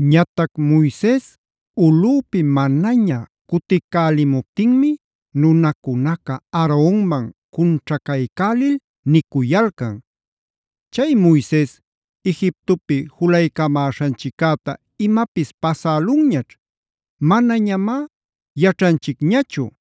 Ñatac Moises ulꞌüpi manaña cuticälimuptinmi nunacunaca Aaronman cunćhacaycälil nicuyalcan: “Chay Moises Egiptopi julaycamäśhanchiccäta imapis pasälunñaćh; manañamá yaćhanchicñachu.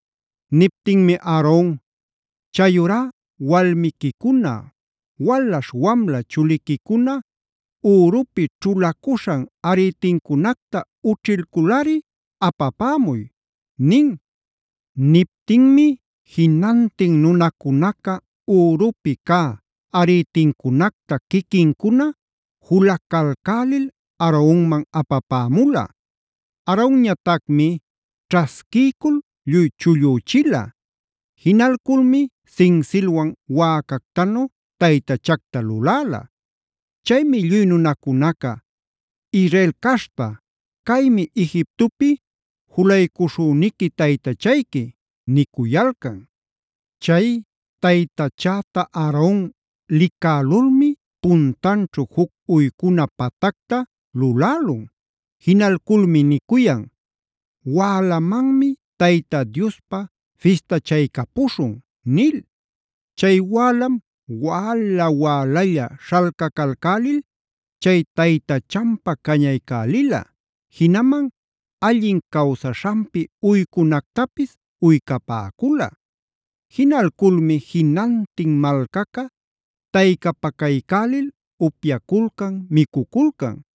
Niptinmi Aaron: “Chayurá walmiquicuna, walaśh wamla chuliquicuna ürupi ćhulacuśhan arïtincunacta ućhilculꞌari apapämuy” nin. Niptinmi jinantin nunacunaca ürupi cä arïtincunacta quiquincuna julacalcälil Aaronman apapämula. Aaronñatacmi ćhasquiycul lluy chullüchila. Jinalculmi sinsilwan wäcactanu taytachacta luläla.b Chaymi lluy nunacunaca: “Israel caśhta, caymi Egiptopi julaycuśhüniqui taytachayqui” nicuyalcan. Chay taytachäta Aaron licälulmi puntanćhu juc uycuna patacta lulälun. Jinalculmi nicuyan: “¡Wälamanmi Tayta Diospä fistachaycapuśhun!” nil. Chay wälam wäla-wälalla śhalcacalcälil chay taytachanpä cañaycälila, jinaman allin cawsaśhanpi uycunactapis uycapäcula. Jinalculmi jinantin malcaca taycapacaycälil upyaculcan, micuculcan.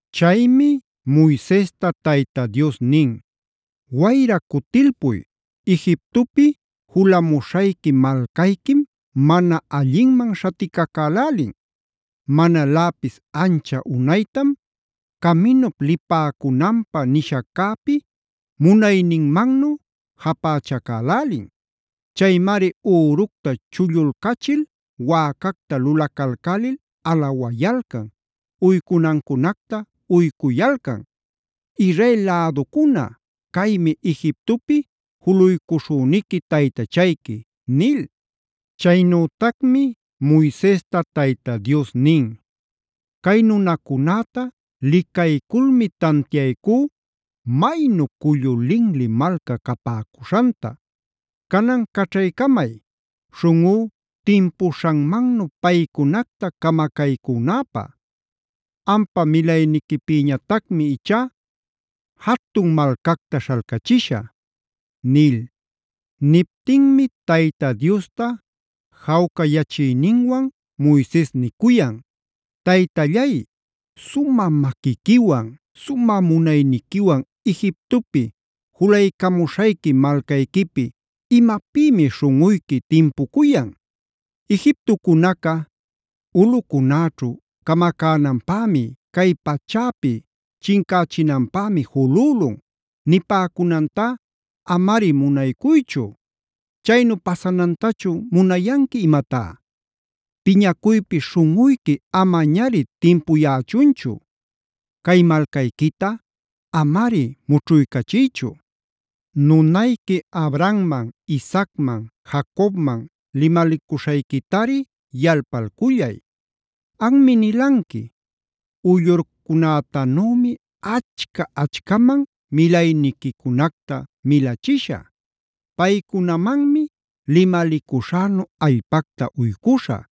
Chaymi Moisesta Tayta Dios nin: “Wayra cutilpuy, Egiptopi julamuśhayqui malcayquim mana allinman śhaticacälälin. Manaläpis ancha unaytam caminup lipäcunanpä nishaccäpi munayninmannu japächacälälin. Chaymari üructa chullulcachil wäcacta lulacalcälil alawayalcan, uycunancunacta uycuyalcan: ‘Israel läducuna, caymi Egiptopi julaycuśhüniqui taytachayqui’” nil. Chaynütacmi Moisesta Tayta Dios nin: “Cay nunacunäta licayculmi tantiaycú maynu cullu linli malca capäcuśhanta. Canan caćhaycamay, śhunꞌú timpuśhanmannu paycunacta camacaycünäpä. Ampa milayniquipïñatacmi ichá jatun malcacta śhalcachishä” nil. Niptinmi Tayta Diosta jawcayachiyninwan Moises nicuyan: “Taytallay, ¿sumä maquiquiwan, sumä munayniquiwan Egiptopi julaycamuśhayqui malcayquipi imapïmi śhunꞌuyqui timpucuyan? Egiptocunaca: ‘Ulꞌucunäćhu camacänanpämi, cay pachäpi chincächinanpämi julülun’ nipäcunantá amari munaycuychu. Chaynu ¿pasanantachun munayanqui imatá? Piñacuypi śhunꞌuyqui amañari timpuyächunchu. Cay malcayquita amari mućhuycachiychu. Nunayqui Abrahamman, Isaacman, Jacobman limalicuśhayquitari yalpalcullay. Anmi nilanqui: ‘Uyllurcunätanümi achca-achcaman milayniquicunacta milachishä.d Paycunamanmi limalicuśhänu allpacta uycuśhä;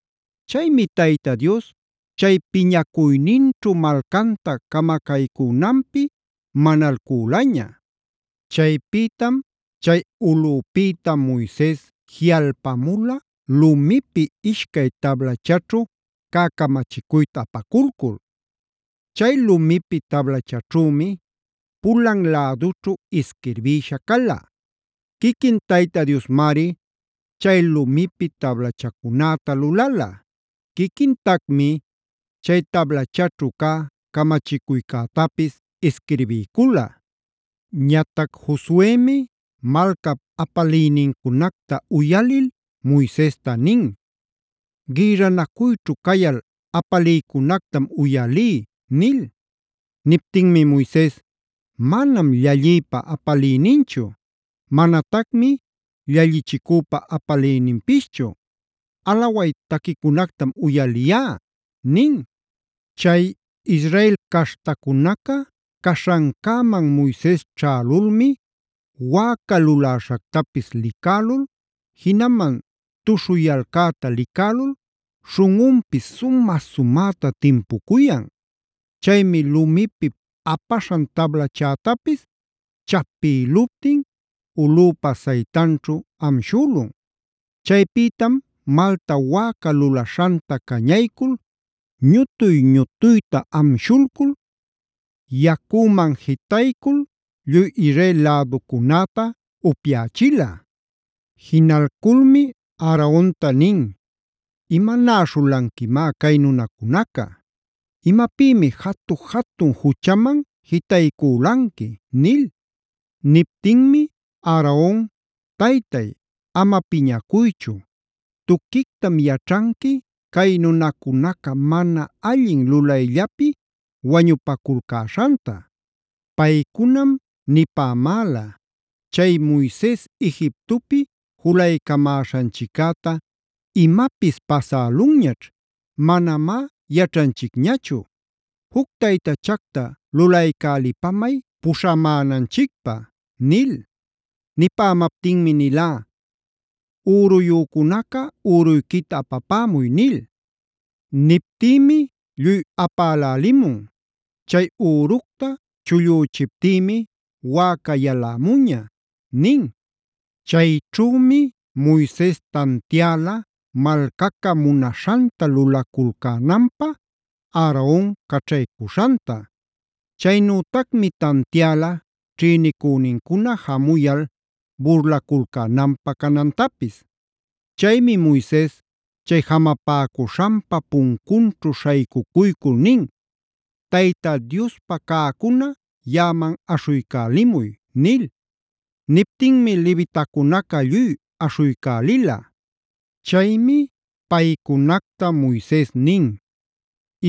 Chaymi Tayta Dios chay piñacuyninćhu malcanta camacaycünanpi manalcülaña.f Chaypïtam chay ulꞌüpïta Moises jiꞌalpamula lumipi ishcay tablachaćhu cä camachicuyta apaculcul. Chay lumipi tablachaćhümi pulan lädućhu isquirbïsha cala. Quiquin Tayta Diosmari chay lumipi tablachacunäta lulala. Quiquintacmi chay tablachaćhu cä camachicuycätapis isquirbiycula. Ñatac Josuemi malcap apaliynincunacta uyalil Moisesta nin: “Gïrranacuyćhu cayal apaliycunactam uyalí” nil. Niptinmi Moises: “Manam llallïpa apaliyninchu. Manatacmi llallichicüpa apaliyninpischu. Alaway taquicunactam uyaliyá” nin. Chay Israel caśhtacunaca caśhancäman Moises ćhälulmi wäca luläśhactapis licälul, jinaman tuśhuyalcäta licälul śhunꞌunpis sumä-sumäta timpucuyan. Chaymi lumipi apaśhan tablachätapis chapïluptin ulꞌüpa saytanćhu amshülun. Chaypïtam malta wäca lulaśhanta cañaycul, ñutuy-ñutuyta amshulcul, yacüman jitaycul lluy Israel läducunäta upyächila. Jinalculmi Aaronta nin: “¿Imanäśhulanquimá cay nunacunaca? ¿Imapïmi jatu-jatun juchaman jitaycülanqui?” nil. Niptinmi Aaron: “Taytay, ama piñacuychu. Tuquictam yaćhanqui cay nunacunaca mana allin lulayllapi wañupaculcäśhanta. Paycunam nipämäla: ‘Chay Moises Egiptopi julaycamäśhanchiccäta imapis pasälunñaćh; manamá yaćhanchicñachu. Juc taytachacta lulaycälipamay puśhamänanchicpä’ nil. Nipämaptinmi nilá: ‘Üruyücunaca üruyquita apapämuy’ nil. Niptïmi lluy apälälimun. Chay üructa chullüchiptïmi wäca yalämuña” nin. Chayćhümi Moises tantiäla malcaca munaśhanta lulaculcänanpä Aaron caćhaycuśhanta. Chaynütacmi tantiäla ćhïnicünincuna jamuyal burlaculcänanpä canantapis. Chaymi Moises chay jamapäcuśhanpa puncunćhu śhaycucuycul nin: “Tayta Diospa cäcunaca yaꞌaman aśhuycälimuy” nil. Niptinmi levitacunaca lluy aśhuycälila. Chaymi paycunacta Moises nin: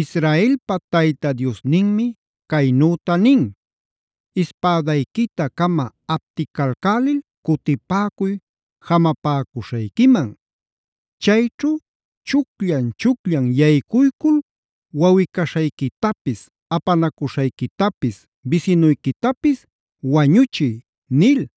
“Israelpa Tayta Diosninmi caynüta nin: ‘Ispädayquita-cama apticalcälil cutipäcuy jamapäcuśhayquiman. Chayćhu chucllan-chucllan yaycuycul wawꞌi-caśhayquitapis, apanacuśhayquitapis, bisinuyquitapis wañuchiy’” nil.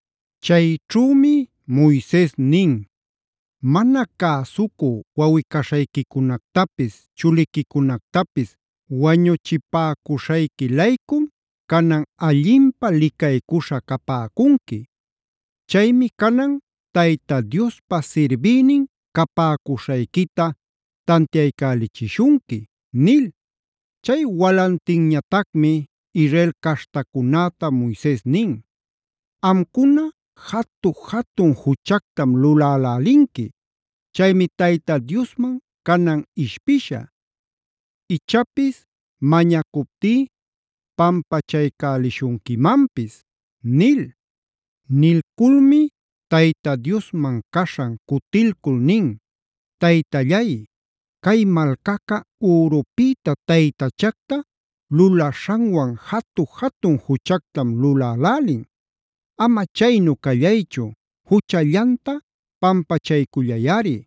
Chayćhümi Moises nin: “Mana cäsucu wawꞌi-caśhayquicunactapis, chuliquicunactapis wañuchipäcuśhayqui-laycum canan allinpä licaycuśha capäcunqui. Chaymi canan Tayta Diospa sirbïnin capäcuśhayquita tantiaycälichishunqui” nil. Chay walantinñatacmi Israel caśhtacunäta Moises nin: “Amcuna jatu-jatun juchactam lulälälinqui. Chaymi Tayta Diosman canan ishpishä, ichapis mañacuptí pampachaycälishunquimanpis” nil. Nilculmi Tayta Diosman caśhan cutilcul nin: “Taytallay, cay malcaca ürupïta taytachacta lulaśhanwan jatu-jatun juchactam lulälälin. Ama chaynu callaychu, juchallanta pampachaycullayꞌari.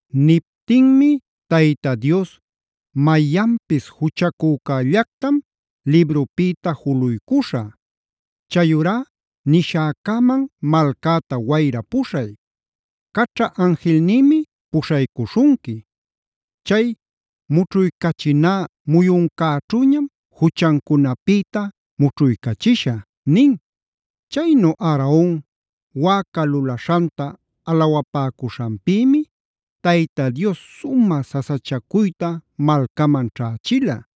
Niptinmi Tayta Dios: “Mayanpis juchacücällactam librupïta juluycuśha. Chayurá nishäcäman malcäta wayra puśhay. Caćha anjilnïmi puśhaycuśhunqui. Chay mućhuycachinä muyuncäćhüñam juchancunapïta mućhuycachishä” nin. Chaynu Aaron, wäca lulaśhanta alawapäcuśhanpïmi Tayta Dios sumä sasachacuyta malcaman ćhächila.